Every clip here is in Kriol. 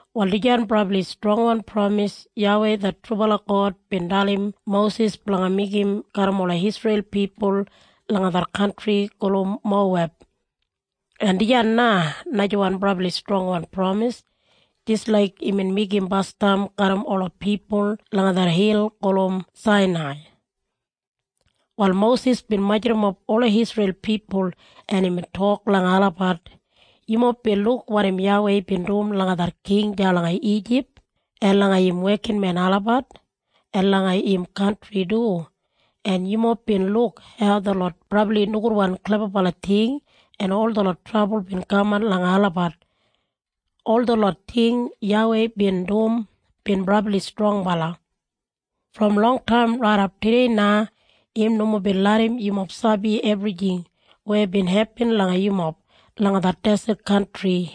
Wal dijan brabli strongwan pramis YAWEI det trubala God bin dalim Mosis blanga meigim garram ola Isreil pipul langa det kantri gulum Moweb. En dijan na najawan brabli strongwan pramis jis laik imbin meigim basdam garram ola pipul langa det hil gulum Sainai. Wal Mosis bin majurrumap ola Isreil pipul en imbin tok langa olabat, “Yumob bin luk wanim YAWEI bin dum langa det king deya langa Ijip, en langa im wekinmen olabat, en langa im kantri du. En yumob bin luk hau detlot brabli nogudwan klebabala ting en ol detlot trabul bin kaman langa olabat. Ol detlot ting YAWEI bin dum bin brabli strongbala. Brom longtaim raidap tudei na im nomo bin larram yumob sabi ebrijing weya bin hepin langa yumob langa det deset kantri.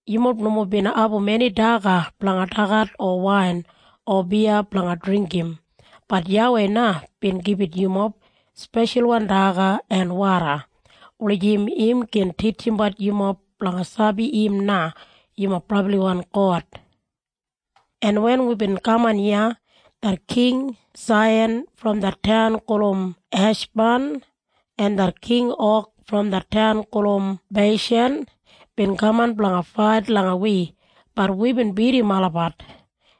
Yumob nomo bin abum eni daga blanga dagat o wain o biya blanga dringgim, bat YAWEI na bin gibit yumob speshalwan daga en woda, wulijim im gin titjimbat yumob blanga sabi im na yumob brabliwan God. En wen wibin kaman iya, det King Saihan brom det taun gulum Heshban, en det King Og brom det taun gulum Beishan bin kaman blanga fait langa wi, bat wibin bidim olabat.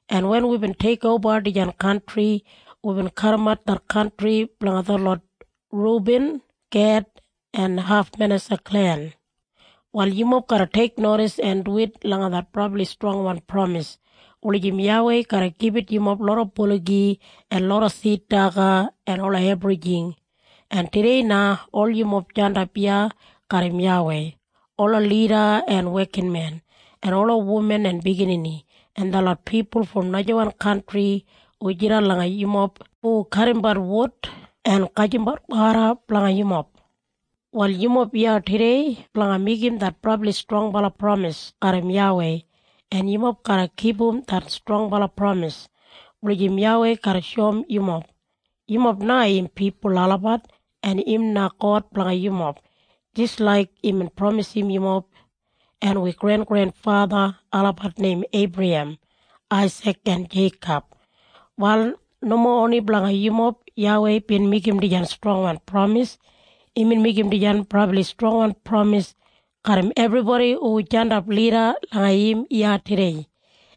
En wen wibin teikoba dijan kantri, wibin kadimat det kantri blanga detlot Rubin, Ged en haf Manesa klen. Wal yumob garra teiknodis en duwit langa det brabli strongwan pramis, wulijim YAWEI garra gibit yumob loda buligi, en loda sid daga en ola ebrijing. “En tudei na ol yumob jandap iya garram YAWEI, ola lida, en wekinmen, en ola wuman en biginini, en detlot pipul brom najawan kantri hu jidan langa yumob hu kadimbat wud en gajimbat woda blanga yumob. Wal yumob iya tudei blanga meigim det brabli strongbala pramis garram YAWEI, en yumob garra kipum det strongbala pramis, wulijim YAWEI garra shoum yumob, yumob na im pipul olabat, en im na God blanga yumob, jis laik imbin pramisim yumob en wi grengrenfatha olabat neim Eibrahem, Aisik en Jeikob. Wal nomo oni blanga yumob YAWEI bin meigim dijan strongwan pramis. Imbin meigim dijan brabli strongwan pramis garram ebribodi hu jandap lida langa im iya tudei,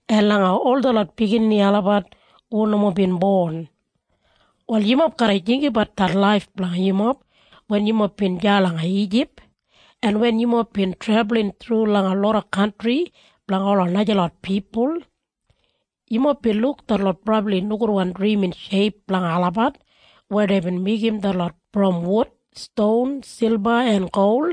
en langa ol detlot biginini olabat hu nomo bin bon. “Wal yumob garra jinggabat det laif blanga yumob wen yumob bin deya langa Ijip, en wen yumob bin trebulin thru langa loda kantri blanga ola najalot pipul. Yumob bin luk detlot brabli nogudwan drimin sheip blanga olabat, weya deibin meigim detlot brom wud, ston, silba en gol.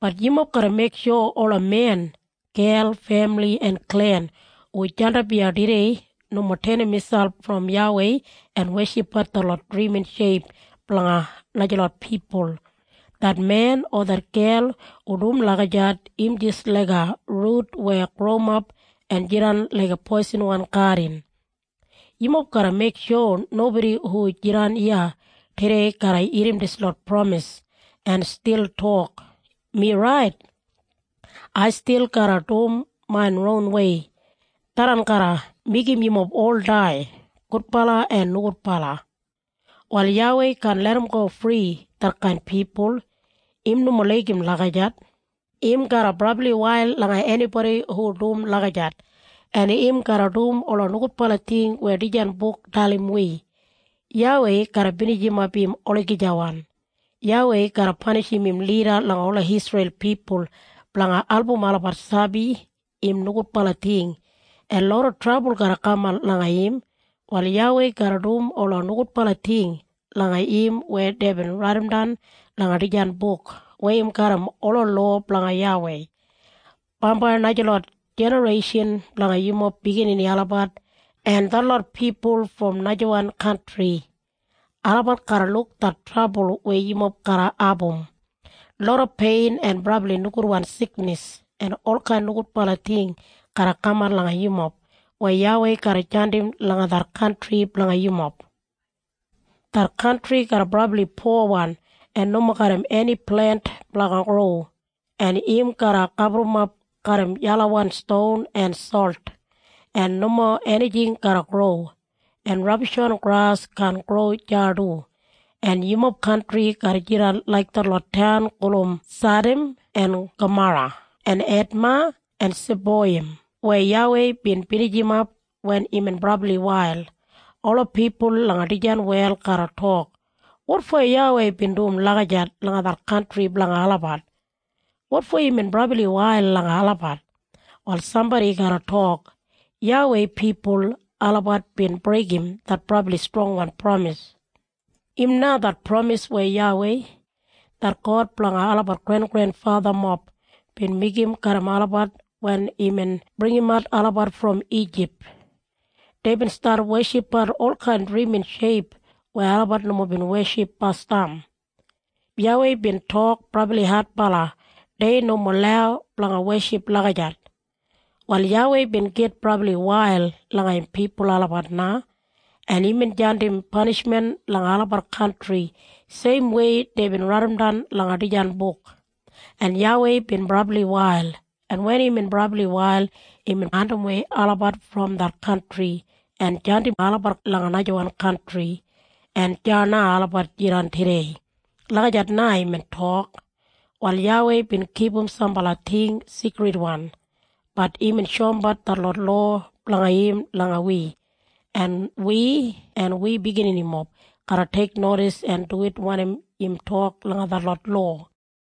Bat yumob garra meiksho ola men, gel, femili en klen hu jandap iya tudei nomo tenim miselp brom YAWEI en weshipbat detlot drimin sheip blanga najalot pipul. Det men o det gel hu dum lagijat im jis laiga rut weya growimap en jidan laiga poisinwan gadin. Yumob garra meiksho nobodi hu jidan iya tudei garra irrim dislot pramis en stil tok, ‘Mi rait. Ai stil garra dum main ronwei.’ Tharran na garra meigim yumob ol dai, gudbala en nogudbala. Wal YAWEI kaan larramgo fri detkain pipul. Im nomo laigim lagijat. Im garra brabli wail langa enibodi hu dum lagijat, en im garra dum ola nogudbala ting weya dijan buk dalim wi. YAWEI garra binijimap im olagijawan. YAWEI garra panishim im lida langa ola Isreil pipul blanga album olabat sabi im nogudbala ting, en loda trabul garra kaman langa im. Wal YAWEI garra dum ola nogudbala ting langa im weya deibin raidimdan langa dijan buk weya im garram ola lowa blanga YAWEI. “Bambai najalot jinareishan blanga yumob biginini olabat en detlot pipul brom najawan kantri, olabat garra luk det trabul weya yumob garra abum. Loda pein en brabli nogudwan siknis en olkain nogudbala ting garra kaman langa yumob weya YAWEI garra jandim langa det kantri blanga yumob. Det kantri garra brabli powan en nomo garram eni plent blanga gro, en im garra gaburrumap garram yelawan ston en solt, en nomo enijing garra gro, en rabishwan gras kaan gro deya du. En yumob kantri garra jidan laik detlot taun gulum Sadam en Gamora en Edma en Seboiyim weya YAWEI bin binijim wen imbin brabli wail. Ola pipul langa dijan wel garra tok, ‘Wotfo YAWEI bin dum lagijat langa det kantri blanga olabat? Wotfo imbin brabli wail langa olabat?’ “Wal sambodi garra tok, ‘YAWEI pipul olabat bin breigim det brabli strongwan pramis. Im na det pramis weya YAWEI, det God blanga olabat grengrenfathamob bin meigim garram olabat wen imbin bringimat olabat brom Ijip. Deibin stat weshipbat olkain drimin sheip weya olabat nomo bin weship basdam. YAWEI bin tok brabli adbala dei nomo lau blanga weship lagijat. Wal YAWEI bin gitwail brabliwei langa im pipul olabat na, en imbin jandim panishmen langa olabat kantri seimwei deibin raidimdan langa dijan buk. En YAWEI bin brabli wail, en wen imbin brabli wail imbin andimwei olabat brom det kantri en jandim olabat langa najawan kantri, en deya na olabat jidan tudei.’ Lagijat na imbin tok. “Wal YAWEI bin kipum sambala ting sigridwan, bat imbin shoumbat detlot lowa blanga im langa wi. En wi en wi bigininimob garra teiknodis en duwit wanim im tok langa detlot lowa.”